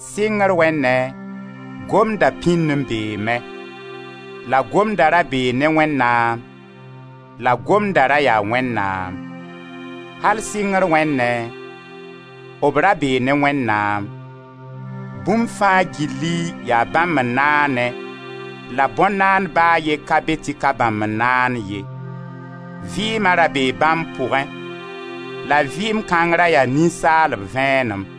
Sɩngr wẽnnẽ, Gomd da pĩnd n beeme; la Gomda ra bee ne Wẽnnaam; la Gomda ra yaa Wẽnnaam. Al sɩngr wẽnnẽ, b ra bee ne Wẽnnaam. Bũmb fãa gilli yaa bãmb n naane, la bõn-naand ba a ye ka be tɩ ka bãmb n naan ye. Vɩɩma ra bee bãmb pʋgẽ, la vɩɩm kãng ra yaa ninsaalb vẽenem.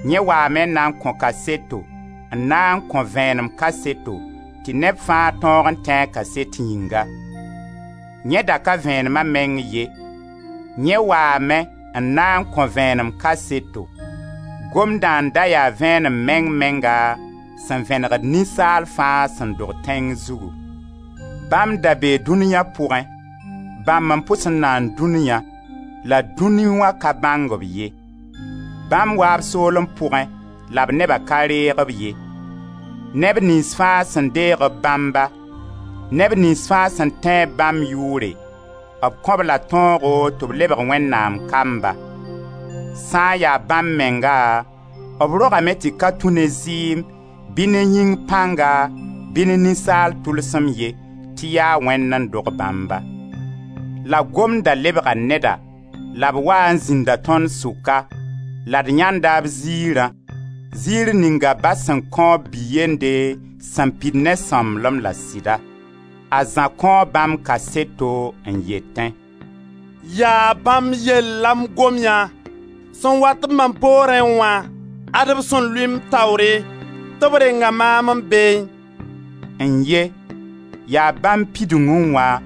Yẽ waame n na n kõ kaseto, n na n kõ vẽenem kaseto, tɩ neb fãa tõog n tẽ a kaset yĩnga. Yẽ da ka vẽenema meng ye, yẽ waame n na n kõ vẽenem kaseto. Gomdã n da ya Vẽenem meng menga, sẽn vẽnegd ninsaal fãa sẽn dog tẽn zugu. Bãmb da bee dũniya pʋgẽ, bãmb n pʋs n naan dũniya la dũni wã ka bãng-b ye. Bãmb waa b soolem pʋgẽ, la b neba ka reeg-b ye. Neb niyns fãa sẽn deeg-b bãmba, neb niyns fãa sẽn tẽ-b bãmb yʋʋre, b kõ-b-la tõogo tɩ b lebg Wẽnnaam kamba. Sã n ya bãmb menga, b rogame tɩ ka tũ ne zɩɩm, bɩ ne yĩng pãnga, bɩ ne ninsaal tʋlsem ye, tɩ yaa Wẽnd n dog bãmba. La Gomda lebga neda, la b waa n zĩnda tõnd sʋka, la d yãenda b ziirã, ziir ninga Ba sẽn kõ b Bi-yende sẽn pid ne sõmblem la sɩda. A Zã kõo bãmb kaseto, n yetẽ: «Yaa bãmb yell la m gom yã: ‹Sẽn wat-b mam poorẽ wã, ad-b sẽn lʋɩ m taoore tɩ b renga maam n beẽ.›» N-ye! Yaa bãmb pidungẽ wã,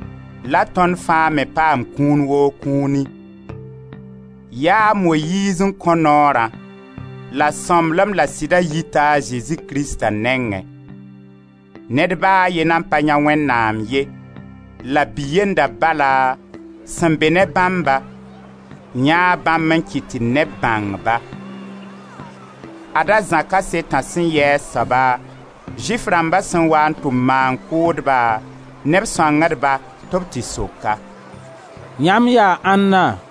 la tõnd fãa me paam kũun woo kũuni. Yaa a Moyiiz n kõ Noorã, la sõmblem la sɩda yita a Zezi Krista nengẽ. Ned ba a ye nan pa yãe Wẽnnaam ye, la b Bi-yenda bala, sẽn be ne bãmba, yãee bãmb n kɩt tɩ neb bãng-ba. Ad-a Zã kasetã sẽn yɩ a soaba, Zʋɩf rãmba sẽn waa n tʋm maan-kʋʋdba ne b sõangdba tɩ b tɩ sok-a: «Yãmb yaa ãnna?»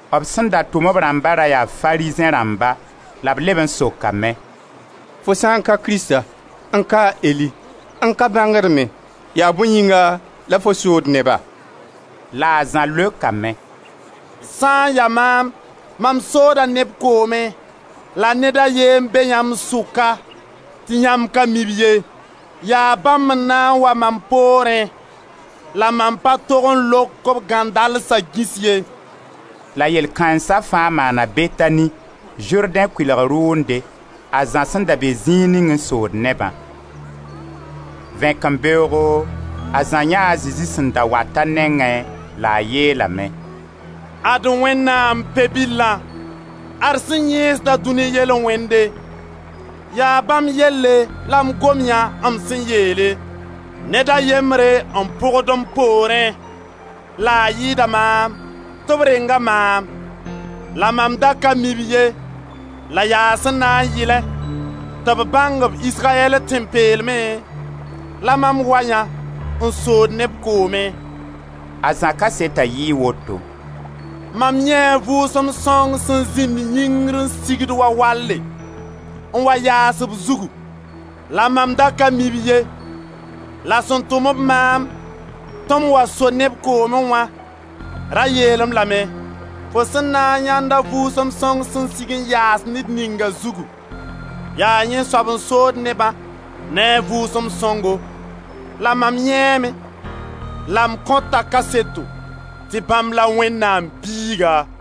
B sẽn da tʋm b rãmba ra yaa Farizẽ rãmba. La b leb n sokame: «Fo sã n ka Krista, n ka a Eli, n ka bãngd me, yaa bõe yĩnga la fo sood neba?» La a Zã leokame: «Sã n ya maam, mam soda neb koomẽ, la ned a ye n be yãmb sʋka, tɩ yãmb ka mi-b ye, yaa bãmb n na n wa mam poorẽ, la mam pa tog n lok b gãndalsa gĩs ye.» La yell-kãensa fãa maana Betani, Zʋrdẽ kʋɩlg rʋʋnde, a Zã sẽn da be zĩig ning n sood nebã. Vẽkembeoogo, a Zã yãe a Zezi sẽn da wat a nengẽ la a yeelame: «Ad Wẽnnaam Pe-bilã, ad sẽn yẽesda dũni yel-wẽnde. Yaa bãmb yelle la m gom yã m sẽn yeele: ‹Ned a yembre n pʋgd m poorẽ, la a yɩɩda maam, tɩ b renga maam.› La mam da ka mi-b ye la yaa sẽn na yɩlẽ tɩ b bãng-b Israyɛl tẽn-peelmẽ, la mam wa yã, n sood neb koomẽ.» A Zã kaseta yɩɩ woto: «Mam yãee a Vʋʋsem Sõng sẽn zĩnd yĩngr n sigd wa walle, n wa yaas b zugu. La mam da ka mi-b ye, la sẽn tʋm b maam tɩ m wa so neb koomẽ wã ra yeel-m lame: ‹Fo sẽn na n yãend a Vʋʋsem Sõng sẽn sig n yaas ned ninga zugu, yaa yẽ soab n sood neba ne a Vʋʋsem sõngo.› La mam yãeeme, la m kõta kaseto, tɩ bãmb la Wẽnnaam Biiga.»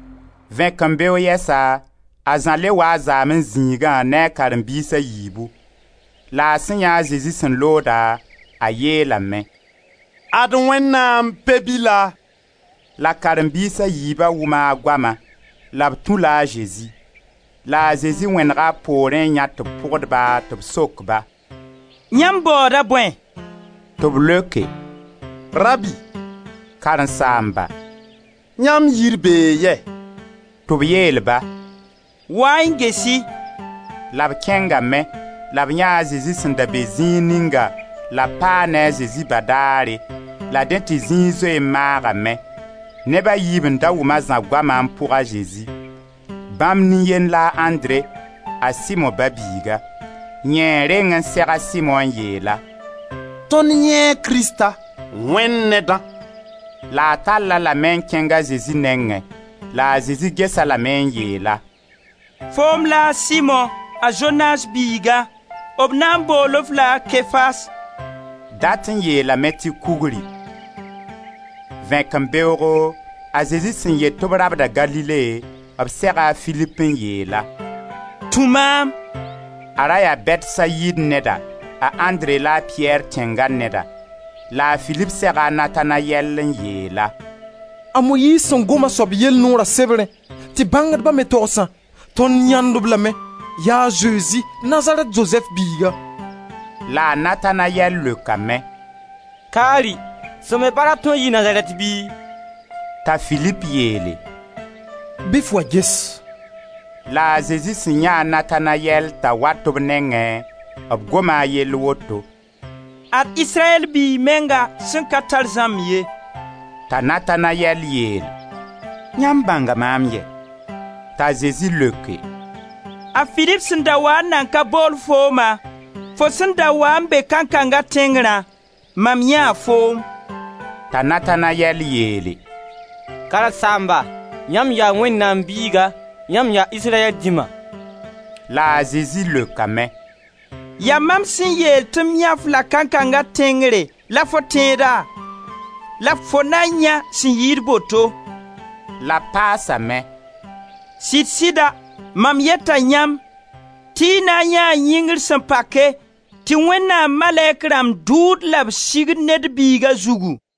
Vẽkẽmbeoog yɛsa, a Zã le waa a zaamẽ zĩigã ne a karen-biis a yiibu. La a sẽn yãee a Zezi sẽn looda, a yeelame: «Ad Wẽnnaam Pe-bila.» La Karen-biis a yiiba wʋma a goama, la b tũ-la a Zezi. La a Zezi wẽnega b poorẽ n yãe tɩ b pʋgd-ba tɩ b sok-ba: «Yãmb baooda bõe?» Tɩ b leoke: «Rabbi, karen-saamba, yãmb yiir bee yɛ?» Tɩ b yeel-ba: «Wa-y n ges-y.» La b kẽngame, la b yãee Zezi sẽn da be zĩig ninga la b paa ne a Zezi badaare, la dẽ tɩ zĩig zoe n maagame. Neb a yiib n da wʋm a Zã goama n pʋg a Zezi. Bãmb nin-yend la a Andre, a Simo ba-biiga. Yẽ n reng n seg a Simo n yeel-a: «Tõnd yãee Krista, Wẽnd Nedã.» La a tall-a lame n kẽng a Zezi nengẽ; la a Zezi ges-a lame n yeel-a: «Foom la a Simo, a Zonas biiga, b na bool-f-la a Kefas» — dat n yeelame tɩ Kugri. Vẽkembeoogo, a Zezi sẽn yet tɩ b rabda Galile, b sega a Filip n yeel-a: «Tũ maam!» A ra yaa Bɛtsayid neda, a Andre la a Piyɛr tẽnga neda. La a Filip sega a Natanayɛl n yeel-a: «A Moyiiz sẽn gom a soab yell Noora sebrẽ tɩ bãngdba me togsã, tõnd yãend-b lame: ya a Zezi, Nazarɛt Zozɛf biiga.» La a Natanayɛl leokame: «Kari! Sẽn be bark tõe n yii Nazarɛt bɩ?» T'a Filip yeele: «Bɩ f wa ges!» La a Zezi sẽn yãee a Natanayɛl t'a wat b nengẽ, b goma a yell woto: «Ad Israyɛl biig menga sẽn ka tar zãmb ye.» T'a Natanayɛl yeel: «Yãmb bãnga maam yɛ?» T'a Zezi leoke: «A Filip sẽn da waa n nan ka bool fooma, fo sẽn da wa n be kankanga tẽngrã, mam yãee foom.» T'a Natanayɛl yeele: «Karen-saamba, yãmb yaa Wẽnnaam Biiga, yãmb yaa Israyɛl Dĩma.» La a Zezi leokame: «Yaa mam sẽn yeel tɩ m yãe-f-la kankanga tẽngre la fo tẽeda, la fo na yãe sẽn yɩɩd boto.» La b paasame: «Sɩd-sɩda, mam yeta yãmb tɩ y na n yãee yĩngr sẽn pake tɩ Wẽnnaam malɛk rãmba dʋʋd la b sigd Ned Biiga zugu.»